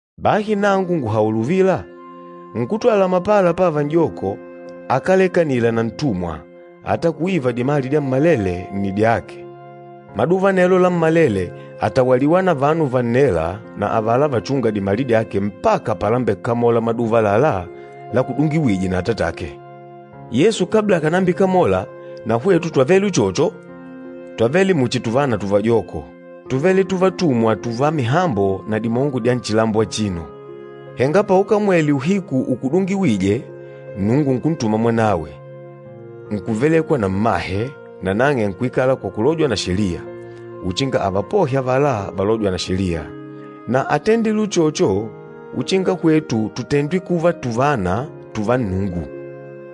Bahi nangu ngùhaula uvila, nkútwala mapala pávà n'joko, akálekanila na ntumwa ata kuiva dimali dyammalele nni dyake. Maduva anelo lammalele àtawaliwa na vanu vannêla na avala vachûnga dimali dyake mpaka palambekamola maduva àlalá lakudungiwîje na atatake. Yesu kabla akànambikamola, na hwetu twavele uchocho. Twavele muchi tuvana tuvajoko, túvele tuvatumwa tùvá mihambo na dimongo dya nchilambo achino. Henga paukamwele uhiku ukudungiwîje, Nnungu nkuntuma Mwanawe, nkuvelekwa na mmahe, nanang'e nkuikala kwa kulojwa na Sheliya, uchinga avapohe avala valôjwa na Sheliya. Na átendile uchocho uchinga hwetu tutendwe kuva tuvana tùvá Nnungu.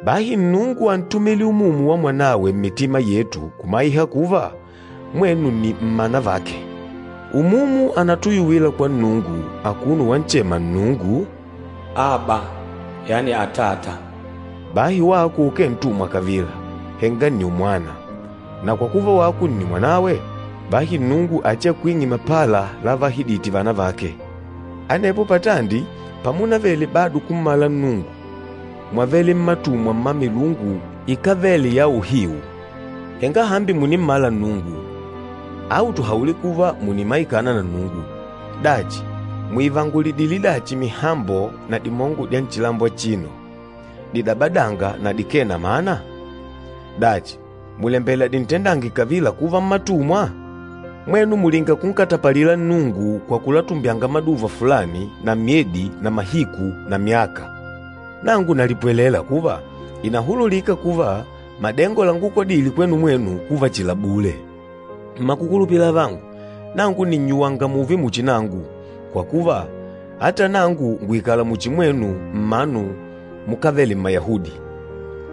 Bahi Nnungu ántumile Umumu wa Mwanawe mmitima yetu kumaiha kuva, mwenu nni mmana vake. Umumu ànatuyuwila kwa Nnungu, akuno wanchema Nnungu, “Aba” yani “Atata.” Bahi wako ukee ntumwa kavila, henga nni umwana, na kwa kuva wako nni mwanawe, bahi Nnungu achiakwing'e mapala lavaahidite vana vake. Anepo patandi pamunavele bado kummala Nnungu, mwávele mmatumwa mma milungu ikávele ya uhiu. Henga hambi mùnimmala Nnungu, au tuhaule kuva mùnimaikana na Nnungu. Dachi, mùivangulidile dachi mihambo na dimongo dya nchilambo achino, didabadânga na dikee na mana? Dachi, mùlembela dintendange kavila kuva mmatumwa? Mwenu mùlinga kunkatapalila Nnungu kwa kulatumbyanga maduva fulani na myedi na mahiku na myaka. Nangu nalipwelela kuva, ìnahululika kuva madengo langukodile kwenu mwenu kuva chihi la bule. Mmakukulupila avangu, nangu nìnnyuwanga mùùve muchi nangu, kwa kuva ata nangu ngùikala muchi mwenu mmanu mukávele Mmayahudi,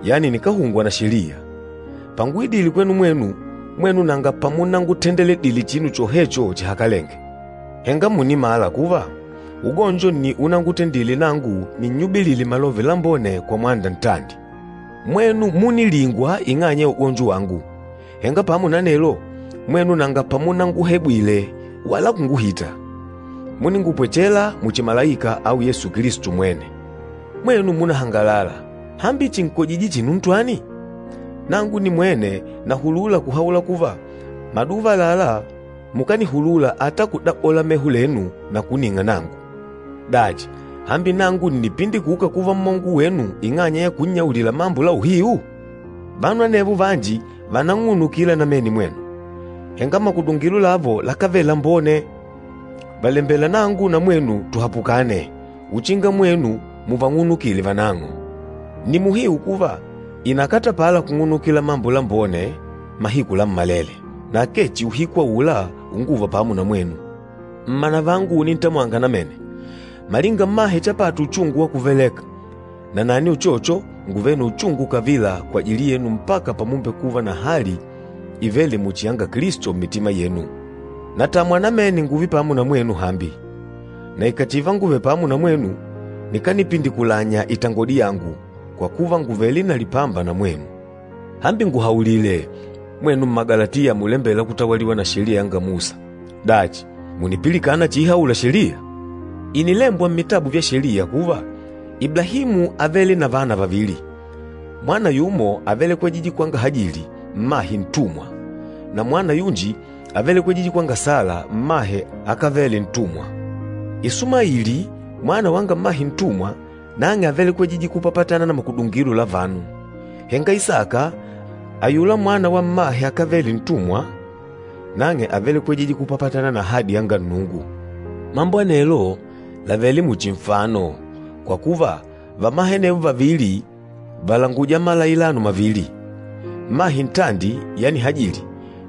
yani nikáhungwa na Sheliya. Panguidile kwenu mwenu, mwenu nanga pamunangutendeledile chinu chohecho chihakalenge. Henga mùnimala kuva, ugonjo nni unangutendile nangu ninnyubilile Malove Lambone kwa mwanda ntandi. Mwenu múnilingwa ing'anya ya ugonjo wangu. Henga pamo na anelo, mwenu nanga pamunanguhebwile wala kunguhita. Múningupwechela muchi malaika au Yesu Kilisto mwene. Mwenu múnahangalala. Hambi chìnkojije chinu ntwani? Nangu nimwene nahulula kuhaula kuva, maduva àlalá mukanihulula ata kudabola meho lenu na kuning'a nangu. Dachi, hambi nangu ǹnipindikuka kuva mmongo wenu ing'anya ya kunnyaulila mambo la uhiu? Vanu anevo vanji vànanng'unukila namene mwenu, henga makudungilo lavo lakávele lambone. Vàlembela nangu na mwenu tuhapukane, uchinga mwenu muvang'unukile vanang'o. Nni muhiu kuva, ìnakatapala kung'unukila mambo lambone mahiku lammalele, na akee chihi uhiku aula unguva pamo na mwenu. Mmanavangu unintamwanga namene, malinga mmahe chapata uchungu wa kuvaleka, nanani uchocho, ngùvele na uchungu kavila kwajili yenu mpaka pamumbekuva na hali ivêle muchi yanga Kilisto mmitima yenu. Natamwa namene ngùùve pamo na mwenu hambi. Na ikàchiva nguvèlè pamo na mwenu, nikanipindikulanya itangodi yangu, kwa kuva ngùvele na lipamba na mwenu. Hambi nguhaulile, mwenu Mmagalatiya mulembêla kutawaliwa na Sheliya yanga Musa, dachi mùnipilikana chiihaula Sheliya? Ìnilembwa mmitabu vya Sheliya kuva, Iblahimu ávele na vana vavili. Mwana yumo ávelekwejije kwanga Hajili, mmahe ntumwa, na mwana yunji ávelekwejije kwanga Sala, mmahe akávele ntumwa. Ishimaeli, mwana wanga mmahe ntumwa, nang'e ávelekwejije kupapatana na makudungilo la vanu, henga Isaka, ayula mwana wa mmahe akávele ntumwa, nang'e ávelekwejije kupapatana na ahadi yanga Nnungu. Mambo anelo làvele muchi nfano, kwa kuva vamahe anevo vavili vàlanguja malailano mavili. Mmahe ntandi, yani Hajili,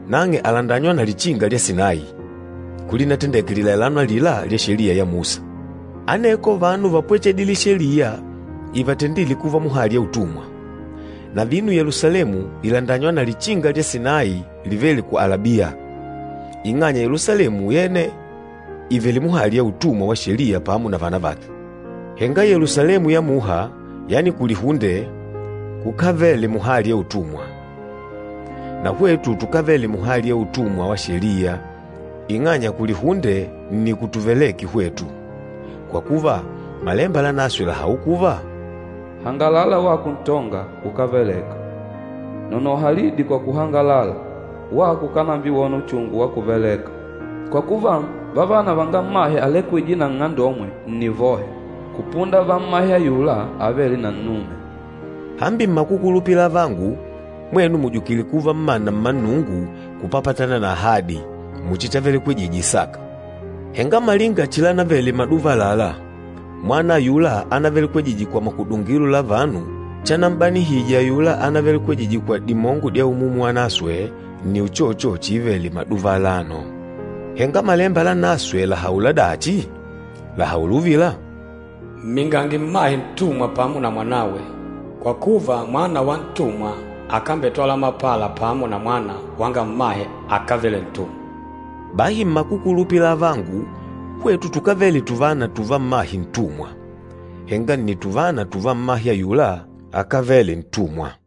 nang'e àlandanywa na lichinga lya Sinayi, kulinatendeke lilailano alila lya Sheliya ya Musa. Aneko vanu vápwechedile Sheliya ivatendîle kuva muhali ya utumwa. Na vino Yelusalemu ìlandanywa na lichinga lya Sinayi livêle ku Alabiya, ing'anya Yelusalemu yene ìvele muhali ya utumwa wa Sheliya pamo na vana vake. Henga Yelusalemu ya muha, yani kulihunde kukávele muhali ya utumwa. Na hwetu tukávele muhali ya utumwa wa Sheliya, ing'anya kulihunde nni kutuveleke hwetu. Kwa kuva, Malemba Lanaswe làhaula kuva, “Hangalala wako ntonga, ukáveleka. Nonoha lidi kwa kuhangalala, wako ukànambiwona uchungu wa kuveleka! Kwa kuva, vavana vanga mmahe alekwîje na nng'andomwe nni vohe, kupunda va mmahe ayula avêle na nnume.” Hambi mmakukulupila avangu, mwenu mùjukile kuva mmana mma Nnungu kupapatana na ahadi, muchi chavelekwejije Isaka. Henga malinga chilanavele maduva àlalá, mwana ayula anavelekwejije kwa makudungilo la vanu chanam'banihije ayula anavelekwejije kwa dimongo dya Umumu Wanaswe, nni uchocho chiivele maduva alano. Henga Malemba Lanaswe làhaula dachi? Làhaula uvila, “Mmingange mmahe ntumwa pamo na mwanawe, kwa kuva mwana wa ntumwa akambetwala mapala pamo na mwana wanga mmahe akávele ntumwa.” Bahi mmakukulupila avangu, hwetu tukávele tuvana tùvá mmahe ntumwa, henga nni tuvana tùvá mmahe ayula akávele ntumwa.